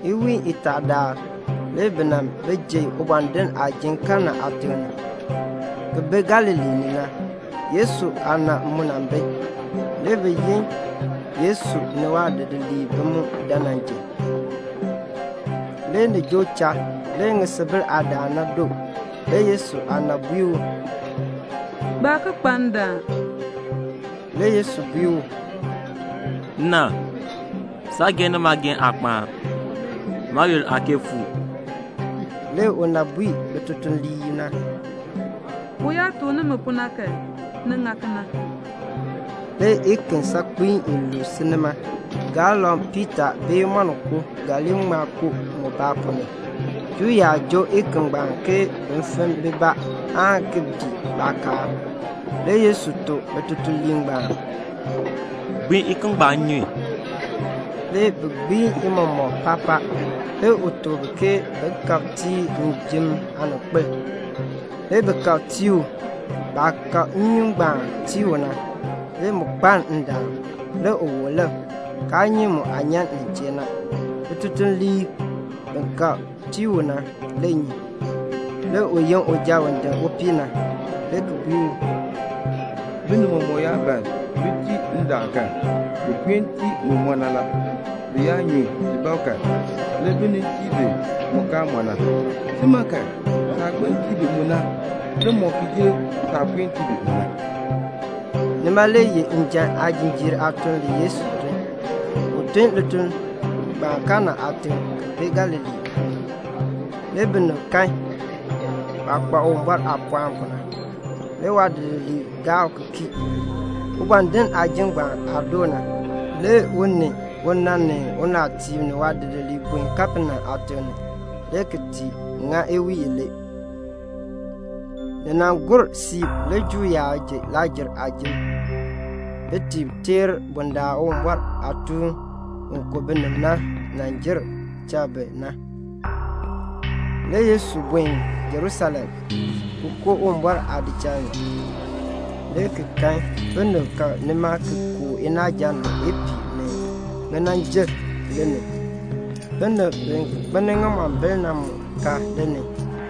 Iwiin itaa daal le bi nan ji ubɔndinn aajim Kana aatiŋ, ki bi Galilee ni na. Yesu aana mu nan bi. Le bi yin Yesu ni waadidiliib bi mu dan nan ji. Le ni joo cha, le ŋisubil aadaan na doo. Le Yesu aana bui u, "Baa ki kpa ndaan." Le Yesu bui u, "Nna, saageehn ni maageehn aa kpaan. Maayoonn aa kee fuu." Le una bui bitutuliib na, "U yaa tuk nimi pu na kan, ni ŋa kena." Le iken saakpiin iluub si nima. Mubaa ga li ŋma joo galoŋ piitaa bee moninko. Juu yaab joo iken ngbaan ke bin ŋir bibaa aan ki dii baakaal. Le Yesu tuk bitutuliib ngbaan, "Gbiin iken ngbaan nnyun." Le bi gbiin i mɔmɔk paapaa. Le u tuk bi ke bin kab tii njim aaninkpil. Le bi kab tii u. Baah kab nnyun ngbaan tii u na, le mu kpaln ndaan. Le u wub lik, kaa nyi mu aah nyan nin chee na. Bitutuliib bi kab tii u na le nyi. Le u yin uja u din upii na, le ki bui u, "Binib mɔmɔk yaa ban bin tii ndaan kan, bi puen tii mu mɔ na la. Bi yaa nyu ti bab kan, le bi nin tii bi mu kaa mɔ na. Si ma kan, saah gbiln tii bi mu na le mɔ ki jer saah puen tii bi mu na." Nima le ye njan aajinjiir aatuln le Yesu tun. U tun lituln ngbaan Kana aatiŋ ki bi Galilee na ni. Le binib kan waah kpa Uwumbɔr aapɔɔn pu na. Le waadidiliib gaa u ki kii. Ubɔndinn aajim ngbaan aah doo na, le u ni una ni unaatiib ni waadidiliib buen Kapenaum aatiŋ ni, le ki ti ŋa iwiin ilee. Ni nan gur siib, le Juu yaab ji Lakr-jer aajim bin ti teer bundaln Uwumbɔr aatuun u ku binib na nan jer cha bi na. Le Yesu buen Jerusalem, ki koo Uwumbɔr aadichal ni, le ki kan binib ka nima ki kooh inaaja ni ipiih ni ŋinanjil ni ni. Binib bi kpelni ŋimombil na mu ka ni ni.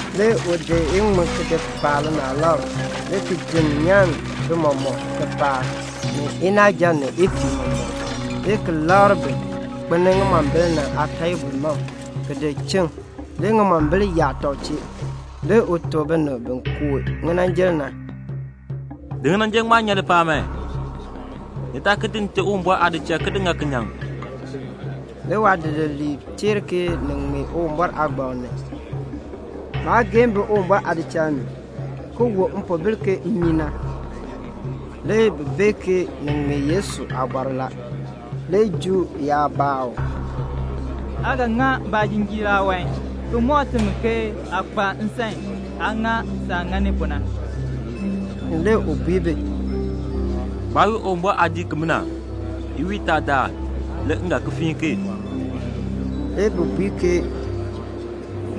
Le u di iŋmin ki di paa linaalab, le ki jenn nyan bi mɔmɔk lipaal, ni inaaja ni ipiih mɔmɔk, le ki labr bin kpelni ŋimombil na aateebl mam ki di chiŋ, le ŋimombil yaa tɔb chee. Le u tuk binib bi kooh ŋinanjil na, "Di ŋinanjil ngbaan nyan lipaal man. Ni taa ki di Nte Uwumbɔr aadichal ki ŋa kinyaŋ." Le waadidiliib teer ke ni ŋmee Uwumbɔr aagbaŋ ni, "Maageehn bi Uwumbɔr aadichal ni, ki wu mpoobil ke mmii na." Le bi bee ke ni ŋmee Yesu aabɔr la. Le Juu yaab baa u, "Aa ga ŋa ba aajinjiir aawan ki mɔk timi ke aa kpa nsan aa ŋa saah ŋani pu na?" Le u bui bi, "Gbaa wii Uwumbɔr aadiik kee. Iwiin itaa le m ga ki fiin ki." Le bi bui ke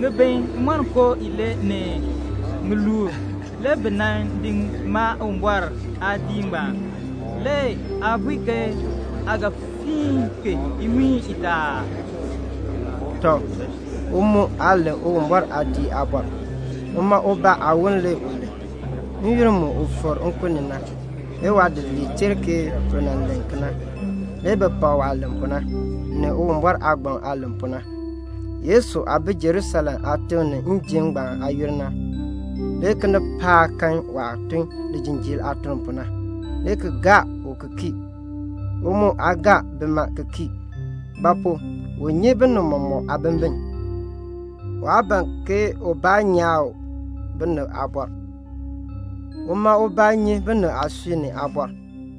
"Ŋibin imonko ilee ni ŋiluub le bi nan di maa Uwumbɔr aadiik ngbaan. Le aa bui ke aa ga fiin ki iwiin itaa aa?" Tɔ, u mu aa len Uwumbɔr aadiik aabɔr. Uma ubaa aawon le u len. N-yoonn mu u fikr nkun ni na, le waadidiliib teer ke u nan len kena. Le bi pak waah len pu na, ni Uwumbɔr aagbaŋ aah len pu na. Yesu aah bi Jerusalem aatiŋ ni njim ngbaan aayoonn na, le kinipaak kan waah tun lijinjiir aatun pu na, le ki gaa u ki kii. U mu aa gaa bima ki kii; ba pu? u nyi binib mɔmɔk aabimbin. Waa ban ke ubaa nyaa u binib aabɔr. Uma ubaa nyi binib aasui ni aabɔr.